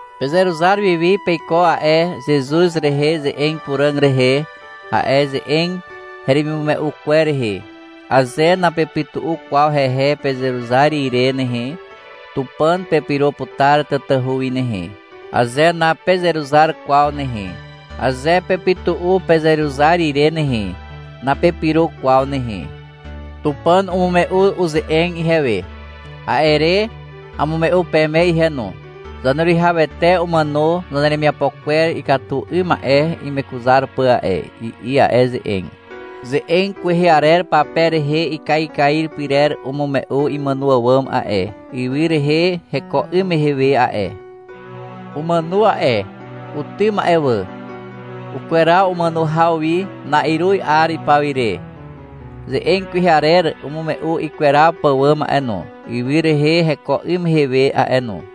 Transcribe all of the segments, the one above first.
Pezeruzar wiwi peiko a'e Zezuz rehe ze'eg puràg rehe, a'e ze'eg heremimume'u kwer rehe. Aze napepytu'u kwaw hehe pezeruzar ire nehe, Tupàn pepyro putar tatahu wi nehe. Aze napezeruzar kwaw nehe, aze pepytu'u pezeruzar ire nehe, napepyro kwaw nehe. Tupàn umume'u uze'eg ihewe. A'e re amume'u peme ihe no. — Zaneruwihawete umàno zaneremiapo kwer ikatu 'ym ma'e imekuzar pà a'e, i'i a'e ze'eg. Ze'eg kwehe arer pape rehe ikaikair pyrer umume'u imàno àwàm a'e, ywy rehe heko 'ym mehe we a'e. Umàno a'e. Utym a'e wà. Ukweraw umàno haw wi, na'iruz 'ar ipaw ire. Ze'eg kwehe arer umume'u ikweraw pàwàm a'e no, ywy rehe heko 'ym mehe a'e no.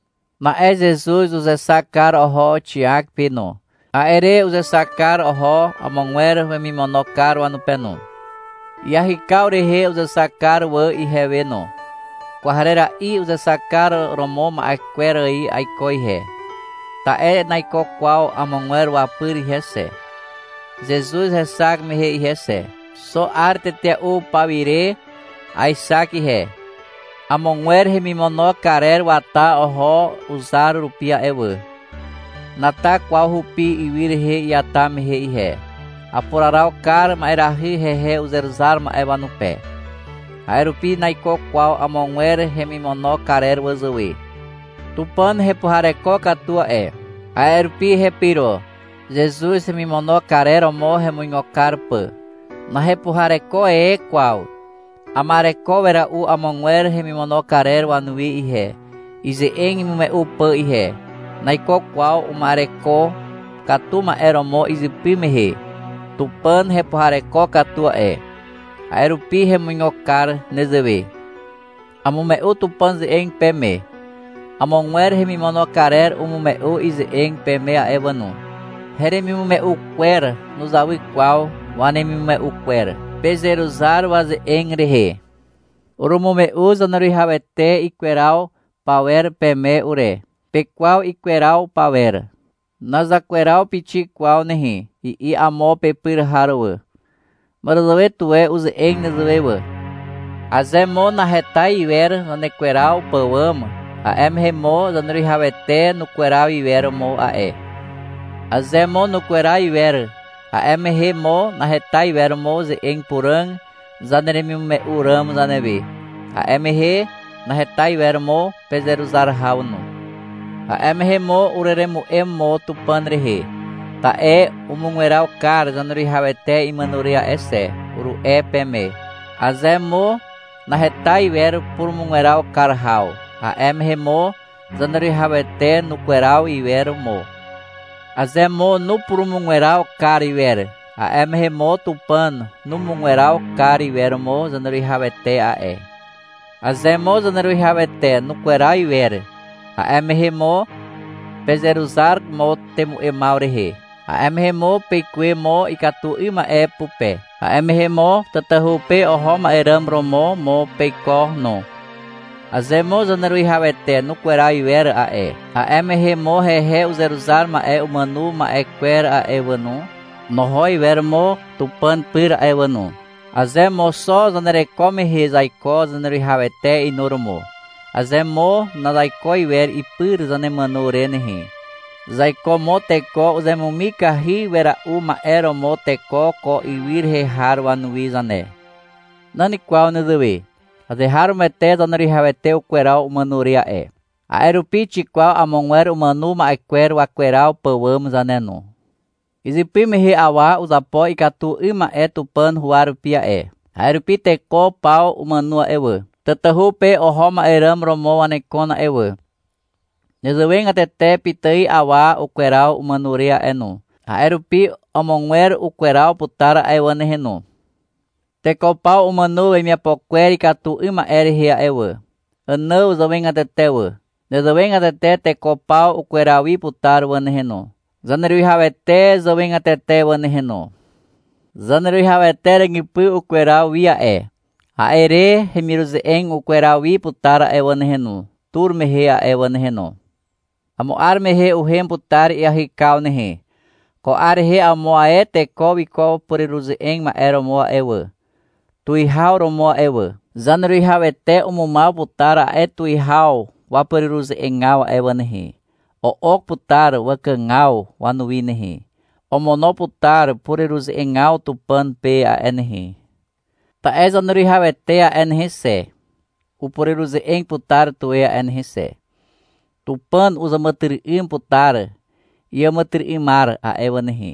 Na'e Zezuz uzexak kar oho Xiak pe no. A'e re uzexak kar oho amogwer wemimono kar wanupe no. Iahykaw rehe uzexak kar wà ihewe no. Kwarera'i uzexak kar romo ma'e kwer ài aiko ihe. Ta'e naiko kwaw amogwer wapyr ihe xe, Zezuz hexak mehe ihe xe. Xo 'ar tetea'u pawire aexak ihe. Amogwer hemimono karer wata oho uzar rupi a'e wà. Nata kwaw hupi ywy rehe iata mehe ihe. Apuraraw kar ma'erahy hehe uzeruzar ma'e wanupe. A'e rupi naiko kwaw amogwer hemimono karer wazàwe. Tupàn hepuhareko katu a'e. A'e rupi hepyro, Zezuz hemimono karer romo hemuigo kar pà. Nahepuhareko e kwaw. Ama'ereko wera'u amogwer hemimono karer wanuwi ihe, ize'eg imume'u pà ihe. Naiko kwaw uma'ereko katu ma'e romo izypy mehe. Tupàn hepuhareko katu a'e, a'e rupi hemuigo kar nezewe. Amume'u Tupàn ze'eg peme. Amogwer hemimono karer umume'u ize'eg peme a'e wà no. Heremimume'u kwer nuzawy kwaw wanemimume'u kwer. Pezeruzar waze'eg rehe. Urumume'u Zaneruwihawete ikweraw pawer peme ure. Pekwaw ikweraw pawer. — Nazakweraw pixik kwaw nehe, i'i amo pepyr har wà. Màràzàwe tuwe uze'eg nezewe wà. Aze mo naheta iwer zanekweraw pàwàm, a'e mehe mo Zaneruwihawete nukweraw iwer mo a'e. Aze mo nukweraw iwer, a'e mehe mo naheta iwer mo ze'eg puràg zaneremimume'u ràm zanewe. A'e mehe naheta iwer mo pezeruzar haw no. A'e mehe mo ureremu'em mo Tupàn rehe, ta'e — Umugweraw kar Zaneruwihawete imàno re a'e xe, uru'e peme. Aze mo naheta iwer purumugweraw kar haw, a'e mehe mo Zaneruwihawete nukweraw iwer mo. Aze mo nupurumugweraw kar iwer, a'e mehe mo Tupàn numugweraw kar iwer mo Zaneruwihawete a'e. Aze mo Zaneruwihawete nukweraw iwer, a'e mehe mo pezeruzar mo temu'emaw rehe. A'e mehe mo peikuwe mo ikatu 'ym ma'e pupe. A'e mehe mo tatahu pe oho ma'e ràm romo mo peiko no. Aze mo Zaneruwihawete nukweraw iwer a'e, a'e mehe mo hehe uzeruzar ma'e umàno ma'e kwer a'e wà no, noho iwer mo Tupàn pyr a'e wà no. Aze mo xo zanereko mehe zaiko Zaneruwihawete inuromo, aze mo nazaiko iwer ipyr zanemàno re nehe, zaiko mo teko uzemumikahy wera'u ma'e romo teko ko ywy rehe har wanuwi zane. Nan kwaw nezewe. Azeharomoete Zaneruwihawete ukweraw umàno re a'e. A'e rupi xikwaw amogwer umàno ma'e kwer wakweraw pàwàm zane no. Izypy mehe awa uzapo ikatu 'ym ma'e Tupàn huwa rupi a'e. A'e rupi teko paw umàno a'e wà. Tatahu pe oho ma'e ràm romo wanekon a'e wà. Nezewegatete pitài awa ukweraw umàno re a'e no. A'e rupi amogwer ukweraw putar a'e wà nehe no. Teko paw umàno wemiapo kwer ikatu 'ym ma'e rehe a'e wà, Ànàw zàwegatete wà. Nezewegatete teko paw ukweraw wi putar wà nehe no, Zaneruwihawete zàwegatete wà nehe no. Zaneruwihawete ràgypy ukweraw wi a'e. A'e re hemiruze'eg ukweraw wi putar a'e wà nehe no, tur mehe a'e wà nehe no. Amo 'ar mehe uhem putar iahykaw nehe. Ko 'ar rehe amo ae teko wiko pureruze'eg ma'e romo a'e wà, tuwihaw romo a'e wà. Zaneruwihawete umumaw putar a'e tuwihaw wapureruze'egaw a'e wà nehe. O'ok putar wakàgaw wanuwi nehe. Omono putar pureruze'egaw Tupàn pe a'e nehe. Ta'e Zaneruwihawete a'e nehe xe, upureruze'eg putar tuwe a'e nehe xe. Tupàn uzàmàtyry'ym putar iàmàtyry'ymar a'e wà nehe.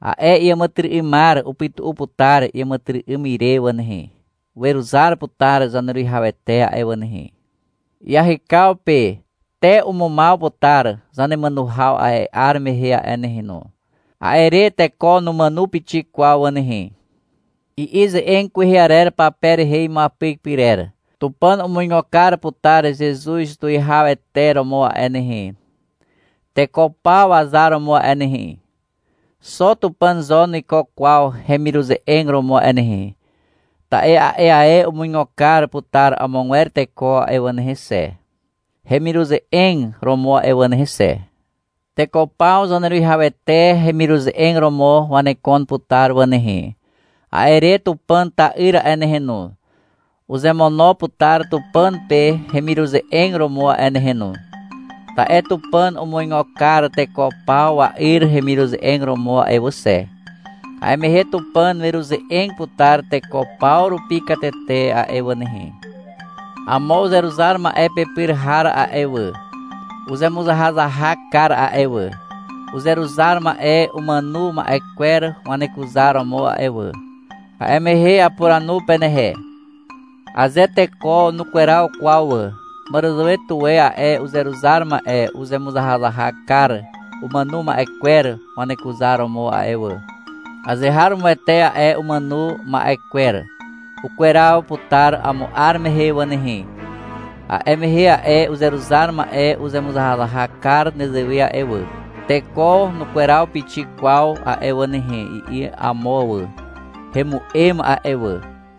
A'e iàmàtyry'ymar upytu'u putar iàmàtyry'ym ire wà nehe. Weruzar putar Zaneruwihawete a'e wà nehe. Iahykaw pe te umumaw putar zanemàno haw a'e 'ar mehe a'e nehe no. A'e re teko numàno pixik kwaw wà nehe. I'i ze'eg kwehe arer pape rehe imuapyk pyrer. — Tupàn umuigo kar putar Zezuz tuwihawete romo a'e nehe, teko paw wazar romo a'e nehe. Xo Tupàn zo nuiko kwaw hemiruze'eg romo a'e nehe. Ta'e a'e ae umuigo kar putar amogwer teko a'e wà nehe xe, hemiruze'eg romo a'e wà nehe xe. Teko paw Zaneruwihawete hemiruze'eg romo wanekon putar wà nehe. A'e re Tupàn ta'yr a'e nehe no, uzemono putar Tupàn pe hemiruze'eg romo a'e nehe no. Ta'e Tupàn umuigo kar teko paw wa'yr hemiruze'eg romo a'e wà xe. A'e mehe Tupàn weruze'eg putar teko paw rupi katete a'e wà nehe. Amo uzeruzar ma'e pepyr har a'e wà, uzemuzahazahak kar a'e wà, uzeruzar ma'e umàno ma'e kwer wanekuzaromo a'e wà. A'e mehe apuranu penehe. Aze teko nukweraw kwaw wà, màràzàwe tuwe a'e uzeruzar ma'e uzemuzahazahak kar umàno ma'e kwer wanekuzaromo a'e wà. Azeharomoete a'e umàno ma'e kwer ukweraw putar amo 'ar mehe wà nehe. A'e mehe a'e uzeruzar ma'e uzemuzahazahak kar nezewe a'e wà. — Teko nukweraw pixik kwaw a'e wà nehe, i'i amo wà. (Hemu'em a'e wà.)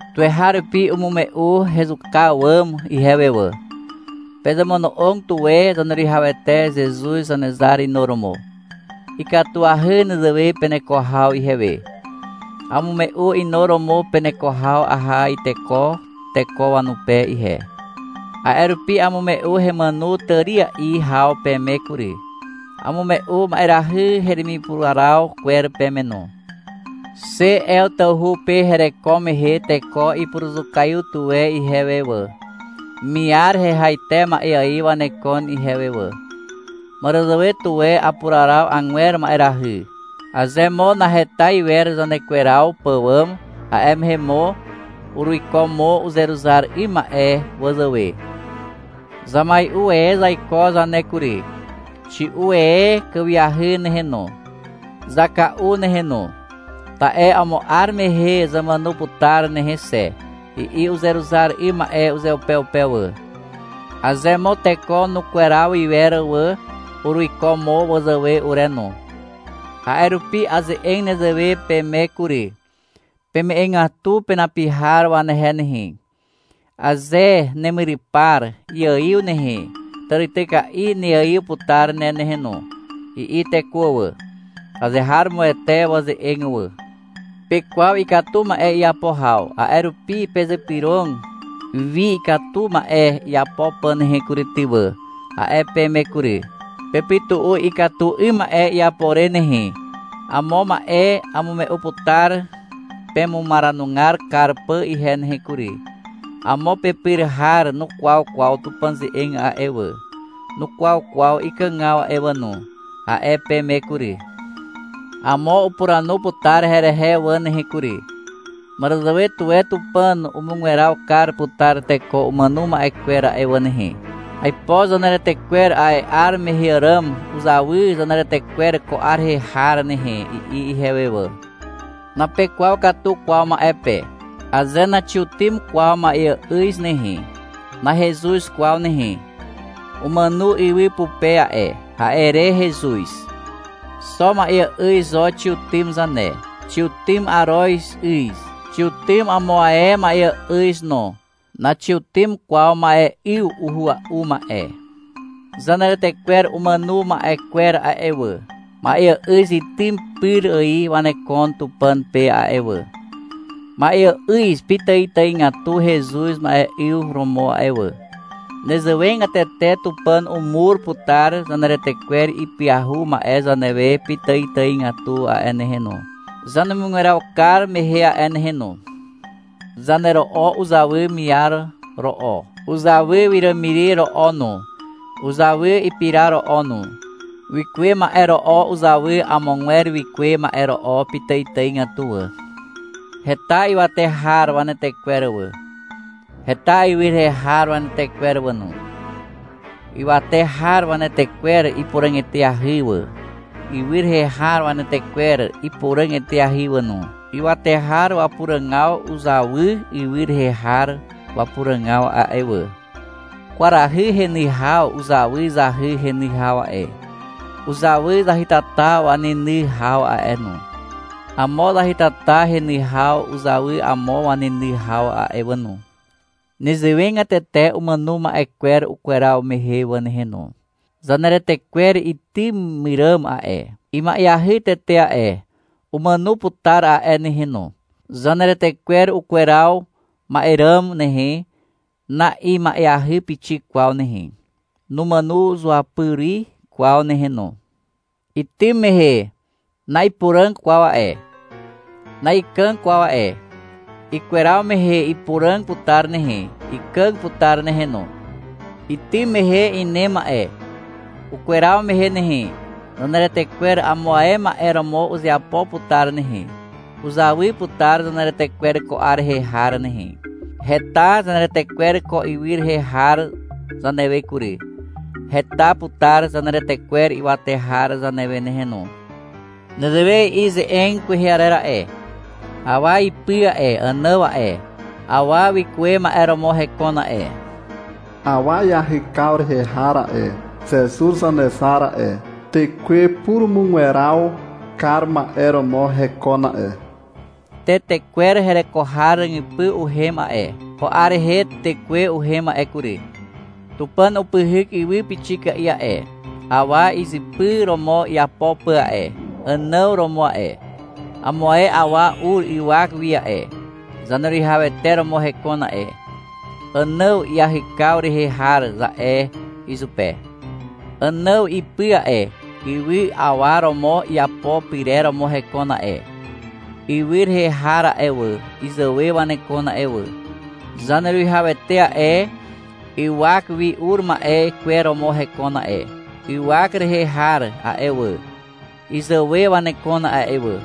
Tuweharupi umume'u hezuka àwàm ihewe wà. Pezemono'og tuwe Zaneruwihawete Zezuz Zanezar inuromo. Ikatuahy nezewe peneko haw ihewe. Amume'u inuromo peneko haw aha iteko teko wanupe ihe. A'e rupi amume'u hemàno tària'i haw peme kury, amume'u ma'erahy heremipuraraw kwer peme no. Xe Ew tawhu pe hereko mehe teko ipuruzukaiw tuwe ihewe wà. Miar hehaite ma'e ài wanekon ihewe wà. Màràzàwe tuwe apuraraw agwer ma'erahy. Aze mo naheta iwer zanekweraw pàwàm, a'e mehe mo uruiko mo uzeruzar 'ym ma'e wazàwe. — Zamai'u e zaiko zane kury. Xi'u e kàwiahy nehe no, zaka'u nehe no. Ta'e amo 'ar mehe zamàno putar nehe xe, i'i uzeruzar 'ym ma'e uzeupeupe wà. Aze mo teko nukweraw iwer wà, uruiko mo wazàwe ure no. A'e rupi aze'eg nezewe peme kury. Peme'egatu penapi har wanehe nehe. — Aze nemyrypar iaiw nehe, tàrityka'i neaiw putar ne nehe no, i'i teko wà. Azeharomoete waze'eg wà. Pekwaw ikatu ma'e iapo haw, a'e rupi — Pezypyrog wi ikatu ma'e iapo pà nehe kury ty wà, a'e peme kury. — Pepytu'u ikatu 'ym ma'e iapo re nehe. Amo ma'e amume'u putar pemumaranugar kar pà ihe nehe kury. — Amo pepyr har nukwaw kwaw Tupàn ze'eg a'e wà, nukwaw kwaw ikàgaw a'e wà no, a'e peme kury. Amo upuranu putar herehe wà nehe kury. -Màràzàwe tuwe Tupàn umugweraw kar putar teko umàno ma'e kwer a'e wà nehe. Aipo zaneretekwer a'e 'ar mehe àràm uzawy zaneretekwer ko 'ar rehe har nehe, i'i ihewe wà. Napekwaw katu kwaw ma'e pe. Aze naxiutym kwaw ma'eà'yz nehe, nahezuz kwaw nehe. Umàno ywy pupe a'e, a'e re hezuz. Xo ma'eà'yz zo xiutym zane. Xiutym aroz 'yz. Xiutym amo ae ma'eà'yz no. Naxiutym kwaw ma'e'yw uhua'u ma'e. Zaneretekwer umàno ma'e kwer a'e wà, ma'eà'yz itym pyr ài wanekon Tupàn pe a'e wà. Ma'eà'yz pitàitàigatu hezuz ma'e'yw romo a'e wà. Nezewegatete Tupàn umur putar zaneretekwer ipyahu ma'e zanewe pitàitàigatu a'e nehe no, zanemugweraw kar mehe a'e nehe no. Zanero'o uzawy miar ro'o. Uzawy wiràmiri ro'o no. Uzawy ipira ro'o no. Wikuwe ma'e ro'o uzawy amogwer wikuwe ma'e ro'o pitàitàigatu wà. Heta ywate har wanetekwer wà. Heta ywy rehe har wanetekwer wà no. Ywate har wanetekwer ipuràg eteahy wà. Ywy rehe har wanetekwer ipuràg eteahy wà no. Ywate har wapuràgaw uzawy ywy rehe har wapuràgaw a'e wà. Kwarahy heny haw uzawy zahy heny haw a'e. Uzawy zahytata waneny haw a'e no. Amo zahytata heny haw uzawy amo waneny haw a'e wà no. Nezewegatete umàno ma'e kwer ukweraw mehe wà nehe no. Zaneretekwer itym myràm a'e, ima'eahy tete a'e, umàno putar a'e nehe no. Zaneretekwer ukweraw ma'e ràm nehe, na'ima'eahy pixik kwaw nehe, numàno zuapyri kwaw nehe no. Itym mehe, na'ipuràg kwaw a'e, na'ikàg kwaw a'e. Ikweraw mehe ipuràg putar nehe, ikàg putar nehe no. Itym mehe inem a'e. Ukweraw mehe nehe, zaneretekwer amo ae ma'e romo uzeapo putar nehe. Uzawy putar zaneretekwer ko 'ar rehe har nehe. Heta zaneretekwer ko ywy rehe har zanewe kury. Heta putar zaneretekwer ywate har zanewe nehe no. Nezewe i'i ze'eg kwehe arer a'e. — Awa ipy a'e, Ànàw a'e, awa wikuwe ma'e romo hekon a'e. Awa iahykaw rehe har a'e, Zezuz Zanezar a'e, tekwe purumugweraw kar ma'e romo hekon a'e. Tetekwer hereko har ràgypy uhem a'e. Ko 'ar rehe Tekwe uhem a'e kury. Tupàn upyhyk ywy pixika'i a'e, awa izypy romo iapo pà a'e. Ànàw romo a'e. Amo ae awa ur ywak wi a'e, Zaneruwihawete romo hekon a'e. -Ànàw iahykaw rehe har, za'e izupe. Ànàw ipy a'e, ywy awa romo iapo pyrer romo hekon a'e. Ywy rehe har a'e wà, izàwe wanekon a'e wà. Zaneruwihawete a'e, ywak wi ur ma'e kwer romo hekon a'e. Ywak rehe har a'e wà, izàwe wanekon a'e wà.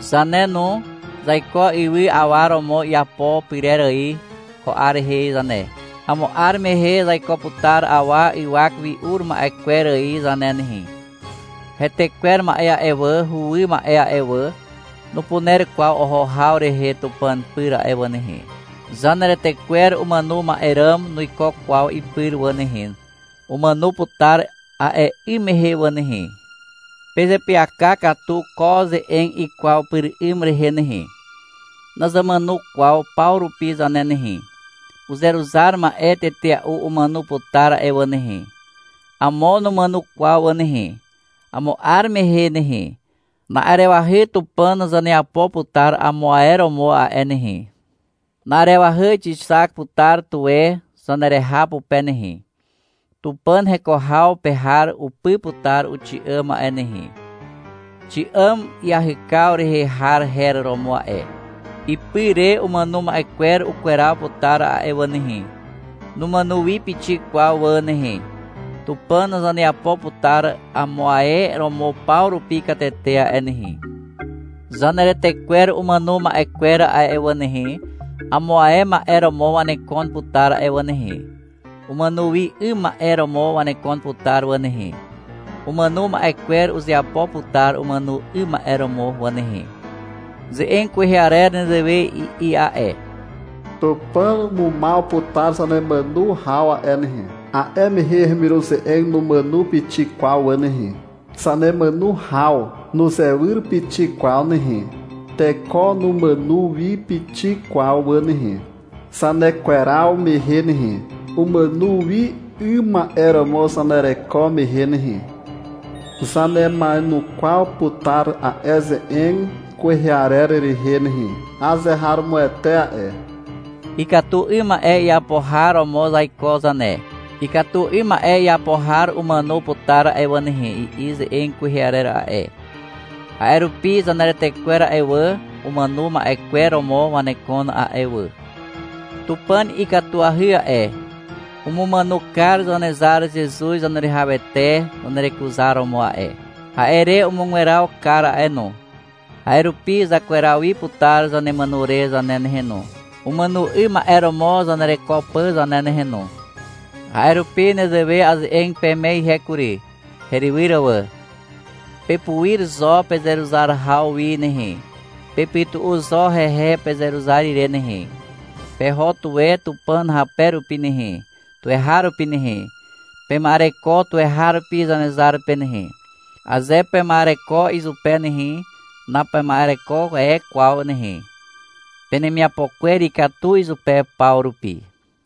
Zane no, zaiko ywy awa romo iapo pyrer ài ko 'ar rehe zane. Amo 'ar mehe zaiko putar awa ywak wi ur ma'e kwer ài zane nehe. Hetekwer ma'e a'e wà, huwy ma'e a'e wà, nupuner kwaw oho haw rehe Tupàn pyr a'e wà nehe. Zaneretekwer umàno ma'e ràm nuiko kwaw ipyr wà nehe. Umàno putar a'e 'ym mehe wà nehe. Pezeapyaka katu ko ze'eg ikwaw pyr 'ym rehe nehe. Nazamàno kwaw paw rupi zane nehe. (Uzeruzar ma'e tetea'u umàno putar a'e wà nehe. Amo numàno kwaw wà nehe.) Amo 'ar mehe nehe, na'arewahy Tupàn zaneapo putar amo ae romo a'e nehe. Na'arewahy xixak putar tuwe zanereha pupe nehe, Tupàn heko haw pe har upy putar uxi'àm a'e nehe. Xi'àm iahykaw rehe har her romo a'e. Ipy re umàno ma'e kwer ukweraw putar a'e wà nehe. Numàno wi pixik kwaw wà nehe. Tupàn zaneapo putar amo ae romo paw rupi katete a'e nehe. Zaneretekwer umàno ma'e kwer a'e wà nehe, amo ae ma'e romo wanekon putar a'e wà nehe. Umàno wi 'ym ma'e romo wanekon putar wà nehe. Umàno ma'e kwer uzeapo putar umàno 'ym ma'e romo wà nehe. Ze'eg kwehe arer nezewe i'i a'e. — Tupàn umumaw putar zanemàno haw a'e nehe. A'e mehe hemiruze'eg numàno pixik kwaw wà nehe. Zanemàno haw nuzewyr pixik kwaw nehe. Teko numàno wi pixik kwaw wà nehe, Zanekweraw mehe nehe, umàno wi 'ym ma'e romo zanereko mehe nehe, zanema'enukwaw putar a'e ze'eg kwehe arer rehe nehe. Azeharomoete a'e. Ikatu 'ym ma'e iapo har romo zaiko zane. — Ikatu 'ym ma'e iapo har umàno putar a'e wà nehe, i'i ze'eg kwehe arer a'e. A'e rupi zaneretekwer a'e wà, umàno ma'e kwer romo wanekon a'e wà. Tupàn ikatuahy a'e. Umumàno kar Zanezar Zezuz Zaneruwihawete zanerekuzaromo a'e. A'e re umugweraw kar a'e no. A'e rupi zakweraw wi putar zanemàno re zane nehe no, umàno 'ym ma'e romo zanereko pà zane nehe no. A'e rupi nezewe aze'eg peme ihe kury, herywyr wà. Pepuir zo pezeruzar haw wi nehe. Pepytu'u zo hehe pezeruzar ire nehe. Peho tuwe Tupàn hape rupi nehe, tuweharupi nehe. Pema'ereko tuweharupi Zanezar pe nehe. Aze pema'ereko izupe nehe, napema'ereko e kwaw nehe. Penemiapo kwer ikatu izupe paw rupi.